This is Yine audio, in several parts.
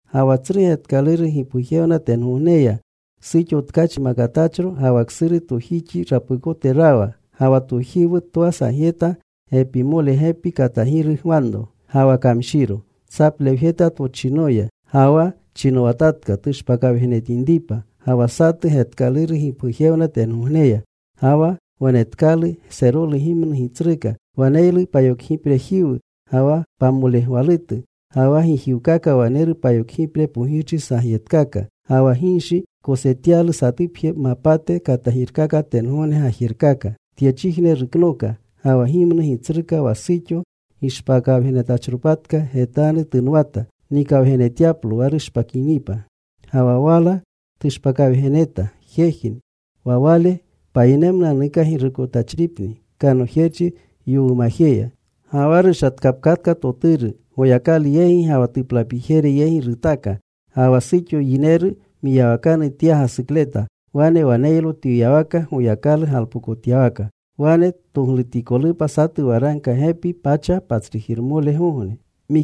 Ga wa tsru getkaluru gipgujewna tengogneya, suxo tkachi makatachro. Ga wa ksuru tojixi rapukote rawa. Ga wa tojiwu twa sagyeta pamole gepi katagiri gwanro. Ga wa kamshiro. Tsaplewjeta tochinoya. Ga wa chinowatatka tushpakawgenetinripa. Ga wa satu getkaluru gipgujewna tengogneya. Ga wa wanetkalu serolu gimnu gitsruka. Waneylu payokgiprejiwu, ga wa pamolegwalutu. Ga wa gijiwkaka waneru payokgipre pogirchi sagyetatkaka. Ga wa ginshi kosetyalu satupje mapate katagirkaka tengogne gajerkaka. Tyechijne ruknooka. Ga wa gimnu gitsruka wa suxo gishpakawgenetachropatka getanu tunwata nikawgenetyaplo wa rushpakinipa. Ga wa wala tushpakawgeneta. Jejni. Wa Wale payinemnunanuka girukotachripni kanojerchi yowumajeya. Ga wa rushatkapkatka Toturu. Goyakalu yegi ga wa tuplapijere yegi rutaaka. Ga wa suxo yineru mwiyawakanu tya gasukleta. Wane waneylo twiyawaka, Goyakalu galpokotyawaka. Wane toglutikolupa satu waragka gepi pacha patsrujirmolegogne.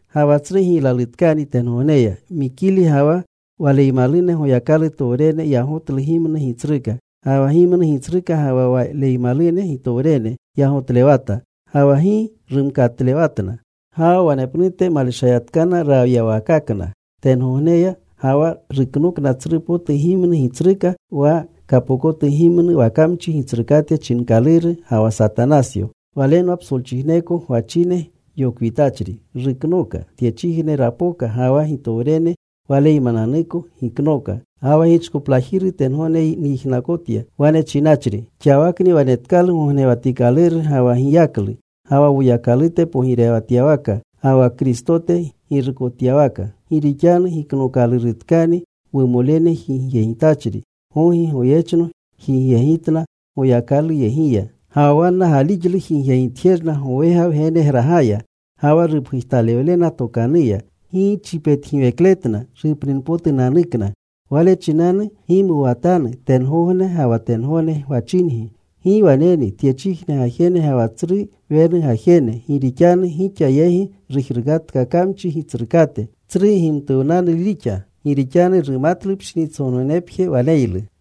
Ga wa tsru giylalutkani tengogneya. Mikili ga wa waleymalune Goyakalutowrene yagotlu gimnu gitsruka. Ga wa gimnu gitsruka ga wa waleymalune gitowrene yagotlewata. Ga wa gi rumkatlewatna. Ga wa wanepnute maleshayatkana rawyawakakna tengogneya Ga wa ruknooka tsru potu gimnu gitsruka wa kapokotu gimnu, wa kamchi gitsrukate chinkaluru, ga wa Satanasyo. Walenwa psolchijneko gwachine yokwitachri. Ruknooka. Tyechijne rapoka. Ga wa gitowrene waleymananuko giknooka. Ga wa gichkoplajiru tengogne nyijnakotya, wane chinachri: Xawakni wanetkalu gognewatikaluru ga wa giyaklu, ga wa Woyakalute pogirewatyawaka, ga wa Kristote girukotyawaka. Gi rixanu giknookalurunatkani wumolene jigyegitachri. Gogi, goyechno jigyegitna Goyakaluyegiya. Ga wa wanna gaalixlu jigyegitjerna gowega Wgenegragaya, Ga wa rupgujtalewlena tokanuya. Ga wa gi chipetgiwekletna rupninpotunanukna. Wale chinanu gimuwatanu tengogne ga wa tengogne gwachingi. ¡Gi waneni tyechijne gajene ga wa tsru wenu gajene, gi rixanu gixa yegi rujrukatka kamchi gitsrukate! Tsru gimtuwnalu rixa. Gi rixanu rumatlu pshinitsongognepje waneylu.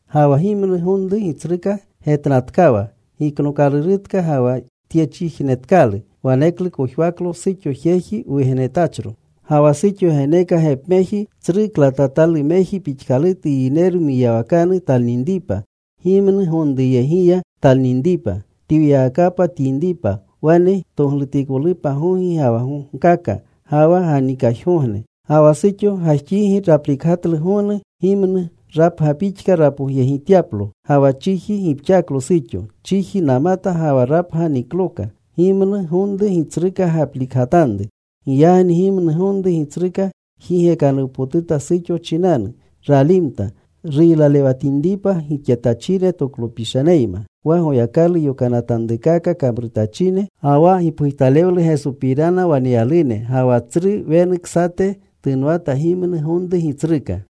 Ga wa gimnu gonru gitsruka getnatkawa giknookalurutka ga wa tyechijnetkalu. Waneklu kojwaklo suxo jeji wugenetachro. Ga wa suxo geneeka gepmeji tsru klatatalumeji pixkalutu yineru mwiyawakanu talninripa, gimnu gonruyegiya talninripa, twiyawakapa tyinripa. Wane toglutikolupa gogi ga wa gogkaka ga wa ganikajgogne. Ga wa suxo gajxigi raplikgatlu gonu gimnu, rapga pixka, rapogyegimtyaplo. Ga wa chiji gipxaklo suxo. Chiji namata, ga wa rapga nikloka, gimnu gonru gitsruka gaplikgatanru. Giyagni gimnu gonru gitsruka jigekanuwpotuta suxo chinanu. Ralimta. Ruylalewatinripa gixetachine toklopishaneyma, wa Goyakalu yokanatanrukaka kamrutachine, ga wa gipgujtalewlu Gesopirana waneyalune. Ga wa tsru wenu ksate tunwata gimnu gonru gitsruka.